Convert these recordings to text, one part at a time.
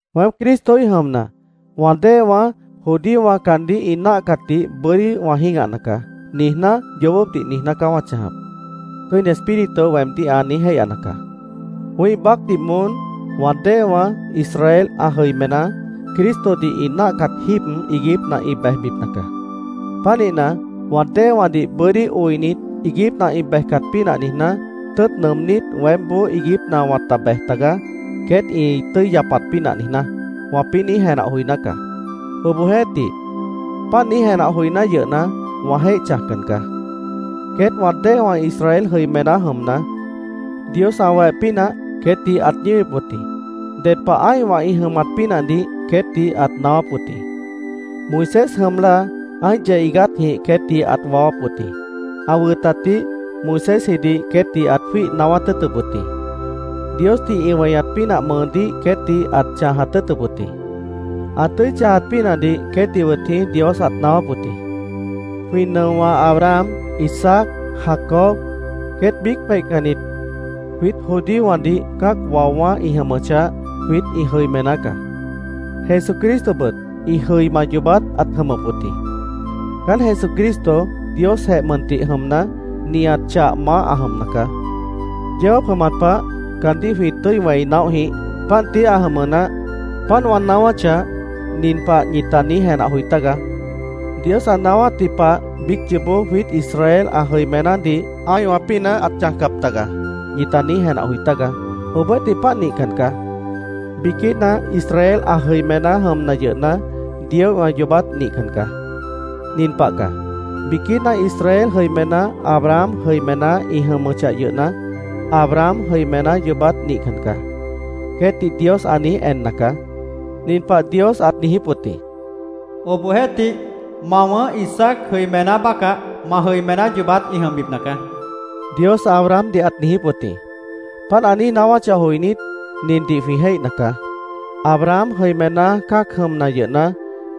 Weém Cristoíh jʉmna, “ ‘Wã déewã, judíowã caandíh ĩ náahcatdih bʉ́dí wã jĩ́gahna caá’, niijná, yoobópdih niijná caá ma chãjap”, Tʉ́ini Espíritu weemdíh ã niíj jéihyana caá. Wĩ́ih baácdih moón, wã déewã, Israel ã jʉimená, Cristodih ĩ náahcat jíib iiguípna ĩ bejbipna caá. Pánihna, “Wã déewãdih bʉ́dí oinit, iiguípna ĩ bejcat pínah niijná, tʉ́ʉt nʉʉmnít, weémboó iiguípna wãta bej tagaá, queét ĩ tʉ́i yapat pínah niijná”, wãpĩ́ niíj jenah joiná caá. Obohjeéhtih, páant niíj jenah joiná yʉhna, wã jéih chãjcan caá. Queét wã déewã Israel jʉimená jʉmna, Dios ã weh pínah queétdih ãt ñíwip wʉt jĩ. Ded pah ã́ihwã ĩ jʉmat pínahdih queétdih ãt naáwáp wʉt jĩ. Moisés jʉm láa ã́ih yeh iigátjĩh queétdih ãt waáwáp wʉt jĩ. Ã wʉtatdih Moisésjidih queétdih ãt jwíih naáwát tʉ́ʉtʉp wʉt jĩ. Diosdih ĩ weñat pínah mʉʉdíh queétdih ãt chãjat tʉ́ʉtʉp wʉt jĩ. Ã tʉ́i chãjat pínahdih queétdih wʉt jĩí Dios ãt naáwáp wʉt jĩ. Jwĩ nʉowã Abraham, Isaac, Jacob queét biíc peihcannit, jwiít judíowãdih cã́ac waowã́ ĩ jʉmʉchah, jwiít ĩ jʉimená caá. Jesucristobʉt, ĩ jʉima yoobát ãt jʉmʉp wʉt jĩ. Caán Jesucristo Diosjeh mʉntih jʉmna, nihat chah maáh ã jʉmna caá. Yeó jáap jʉmat pah caandíh jwĩ tʉ́i wẽi naóh jĩíh. Páant tií ã jʉmʉ naáh. Páant wã naáwáchah, nin pah ñita niíj jenah joi tágaá: “Dios ã naáwátji pah biíc yoobó jwiít Israel ã jʉimenádih ã́ihwã pínah ãt chãjcap taga”, ñita niíj jenah joi tágaá. Obohjeéhtih, páant nihcan caá. Biquína Israel ã jʉimená jʉmna yʉhna, Dioíhwã yoobát nihcan caá. Nin pah caá: Biquína Israel jʉimená Abraham jʉimená ĩ jʉmʉchah yʉhna, “Abraham jʉimená yoobát nihcan caá”, queétdih Dios ã niíj enna caá. Nin pah Dios ãt niijíp wʉt jĩ: “Obohjeéhtih, ma wʉ̃ʉ́h Isaac jʉimená bácah ma jʉimená yoobát ĩ jʉmbipna caá”, Dios Abrahamdih ãt niijíp wʉt jĩ. Páant ã niíj naáwáchah joinít, nindih jwĩ jéihna caá: Abraham jʉimená cã́ac jʉmna yʉhna,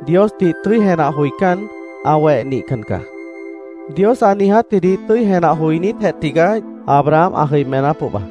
Diosdih tʉ́i jenah joicán, ã weh nihcan caá. Dios ã niijátjidih tʉ́i jenah joinítjeh tigaá Abraham ã jʉimená pohba.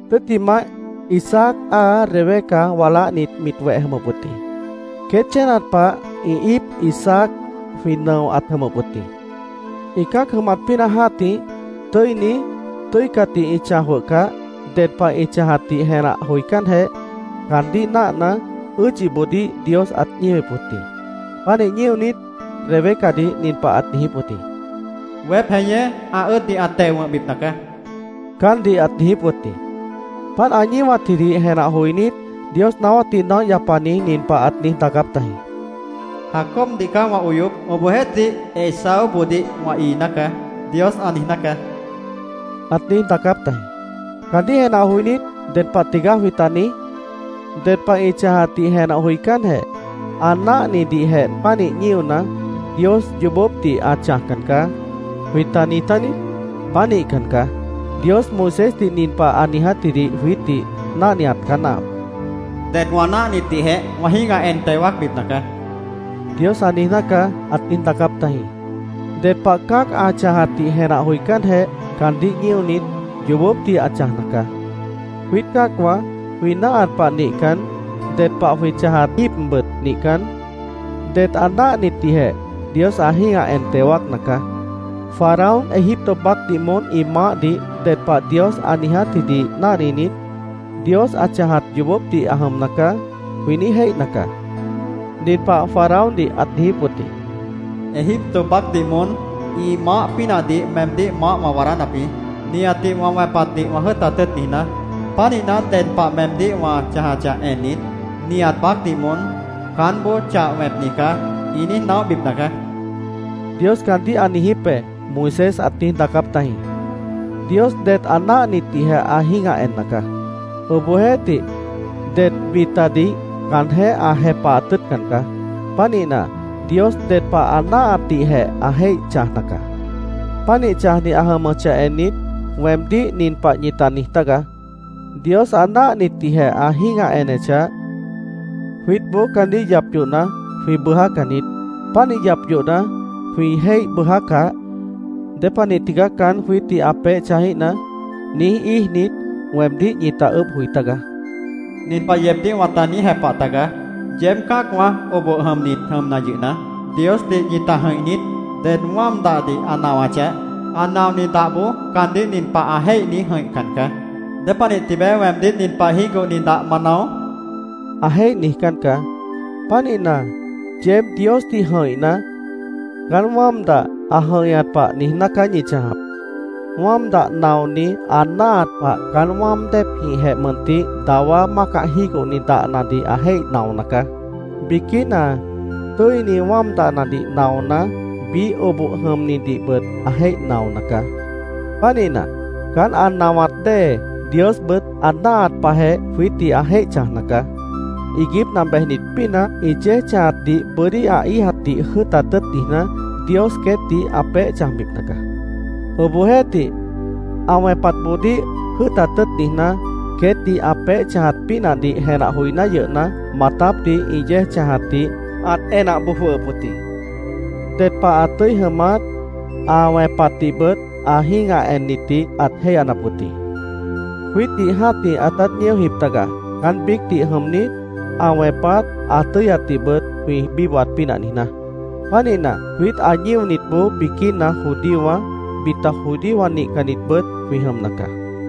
Tʉ́ttimah, Isaac áa Rebeca waláhnit mit weh jʉmʉp wʉt jĩ. Queét chénat pah ĩ íip Isaac jwĩ nʉo ãt jʉmʉp wʉt jĩ. Ĩ cã́ac jʉmat pínah jã́tih, tʉ́ini, tʉ́icatdih ĩ chãj jwʉhcah, ded pah ĩ chãjatdih jenah joicánjeh, caandíh náahna, ʉ́ʉdyiboodíh Dios ãt ñíwip wʉt jĩ. Pánih ñíonit, Rebecadih nin pah ãt niijíp wʉt jĩ: “Weép jeñé ã ʉ́ʉddih ã teo wʉ̃hbipna caá”, caántdih ãt niijíp wʉt jĩ. Páant ã ñíwatjidih jenah joinít, Dios naáwátdih naóh yapani nin pah ãt niíj daacáp tajĩ: “ ‘Jacobdih caá wã oyop. Obohjeéhtih, Esaúboodíh wã iiná caá’, Dios ã niijná caá”, ãt niíj daacáp tajĩ. Caandíh jenah joinít ¿ded pah tigaá jwĩta niíj? “Ded pah ĩ chãjatdih jenah joicánjeh, ã náahnidihjeh pánih ñíona, Dios yoobópdih ã chãjcan caá”, ¿jwĩta niij tániít? ¡Pánihcan caá! Dios Moisésdih nin pah ã niijátjidih jwiítdih náhniat caá náahap: “Det wã náahnitdihjeh wã jĩ́gah en teo wáacbipna caá”, Dios ã niijná caá, ãt niíj daacáp tajĩ. Ded pah cã́ac ã chãjatdih jenah joicánjeh caandíh ñíonit, yoobópdih ã chãjna caá. Jwiít cã́acwã jwĩ náahat pah nihcan, ded pah jwĩ chãjat jíibbʉt nihcan, det ã náahnitdihjeh Dios ã jĩ́gah en teo wáacna caá. Faraón Egipto baácdih moón ĩ maáhdih ded pah Dios ã niijátjidih náhninit, “Dios ã chãjat yoobópdih ã jʉmna caá”, jwĩ niíj jéihna caá. Nin pah Faraóndih ãt niijíp wʉt jĩ: “Egipto baácdih moón ĩ maáh pínahdih meemdíh maáh wã waadánap jĩ, nihatdih wã wẽpatdih wã jʉ́ʉtat tʉ́ʉt niijná. Pánihna, ded pah meemdíh wã chãjachah ennit, nihat baácdih moón ‘Caánboó chah wẽpni caá’, ĩ niíj naóhbipna caá”, Dios caandíh ã niijíp be, Moisés ãt niíj daacáp tajĩ. Dios det ã náahnitdihjeh ã jĩ́gah enna caá. Obohjeéhtih, det bitadih caanjéh ã jepahat tʉ́ʉtcan caá. Pánihna, Dios ded pah ã náahatdihjeh ã jéih chãjna caá. Pánih chãjni ã jʉmʉchah ennit, weemdíh nin pah ñita niij tágaá: “Dios ã náahnitdihjeh ã jĩ́gah enechah, jwiítboó caandíh yap yohna, jwĩ bʉjácan niít. Pánih yap yohna, jwĩ jéih bʉʉjácah, ¿dépanih tigaá caán jwiítdih ã peéh chãjíhna?” niíj íijnit, weemdíh ñita ʉʉ́bh joi tágaá. Nin pah yeebdíh wãta niíj jepah taga: ¿Yeéb cã́acwã oboh jʉmnit jʉmna yʉhna, Diosdih ñita jʉ̃ih niít? Ded wáam dahdih ã nawachah, ã naoni dahboó caandíh nin pah ã jéih niíj jʉ̃ihcan caá: “¿Dépanih tibeé weemdíh nin pah jígohni dah ma nao?” ã jéih niijcán caá. Pánihna, yeéb Diosdih jʉ̃ihna, caán wáam dah ã jʉ̃ihñat pah niijná caá ñi chãjap. Wáam dah naoni ã náahat pah caán wáam déepjĩhjeh mʉntih dawá mácah jígohni dahnadih ã jéih naona caá. Biquína tʉ́ini wáam dahnadih naona, biíh oboh jʉmnidihbʉt ã jéih naona caá. Pánihna, caán ã nawat dée, Diosbʉt ã náahat pahjeh jwiítdih ã jéih chãjna caá. Iiguípna bejnit pínah ĩ yéej chãjatdih bʉ́dí ã íijatdih jʉ́ʉtat tʉ́ʉt niijná, Dios queétdih ã peéh chãjbipna caá. Obohjeéhtih, ã wẽpatboodíh jʉ́ʉtat tʉ́ʉt niijná, queétdih ã peéh chãjat pínahdih jenah joiná yʉhna, maatápdih ĩ yéej chãjatdih ãt enah boj jwʉhʉp wʉt jĩ. Ded pah ã tʉ́i jʉmat, ã wẽpatdihbʉt ã jĩ́gah ennitdih ãt jéihyanap wʉt jĩ. Jwiítdih jã́tih ãtát ñíojip taga, caán biícdih jʉmnit, ã wẽpat, ã tʉ́yatdihbʉt jwĩ bíbohat pínah niijná. Pánihna, jwiít ã ñíonitboó biquína judíowã, bita judíowã nihcannitbʉt jwĩ jʉmna caá.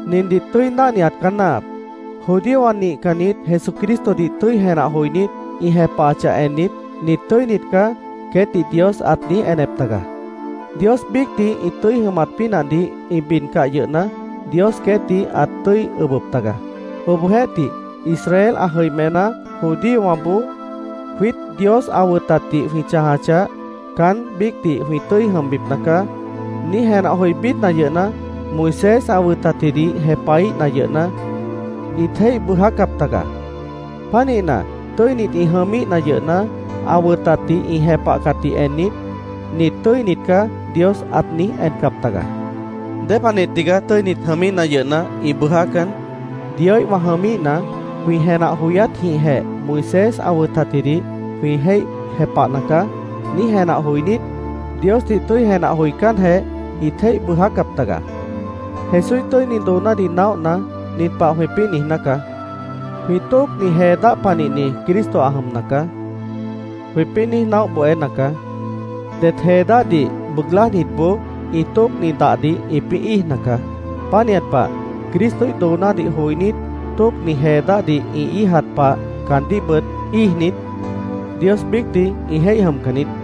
Nindih tʉ́i náhniat caá náahap: judíowã nihcannit Jesucristodih tʉ́i jenah joinít, ĩ jepahachah ennit, “Nit tʉ́init caá”, queétdih Dios ãt niíj enep taga. Dios biícdih ĩ tʉ́i jʉmat pínahdih ĩ bidcah yʉhna, Dios queétdih ãt tʉ́i ʉbʉp taga. Obohjeéhtih, Israel ã jʉimená judíowãboó “Jwiít Dios ã wʉtatdih jwĩ chãjachah, caán biícdih jwĩ tʉ́i jʉmbipna caá”, niíj jenah joí bidna yʉhna, Moisés ã wʉtatjidih jepahíhna yʉhna, ĩt jéih bʉʉjácap taga. Pánihna, tʉ́init ĩ jʉmíhna yʉhna, ã wʉtatdih ĩ jepahcatdih ennit, “Nit tʉ́init caá”, Dios ãt niíj encap taga. ¿Dépanih tigaá tʉ́init jʉmíhna yʉhna, ĩ bʉʉjácan? “Dioíhwã jʉmíhna, jwĩ jenah joyátjĩhjeh Moisés ã wʉtatjidih jwĩ jéih jepahna caá”, niíj jenah joinít, Diosdih tʉ́i jenah joicánjeh, ĩt jéih bʉʉjácap taga. Jesúíh tʉ́ini doonádih naóhna, nin pah jwĩpĩ́ niijná caá: “Jwĩ tóocni jee dáh panihni Cristo ã jʉmna caá”, jwĩpĩ́ niíj naóh bohéna caá. Det jee dáhdih bʉʉg lájnitboó ĩ tóocni dahdih ĩpĩ́ íijna caá. Pánihat pah, Cristoíh doonádih joinít, tóocni jee dáhdih ĩ íijat pah caandíhbʉt íijnit, Dios biícdih ĩ jéih jʉmcan niít.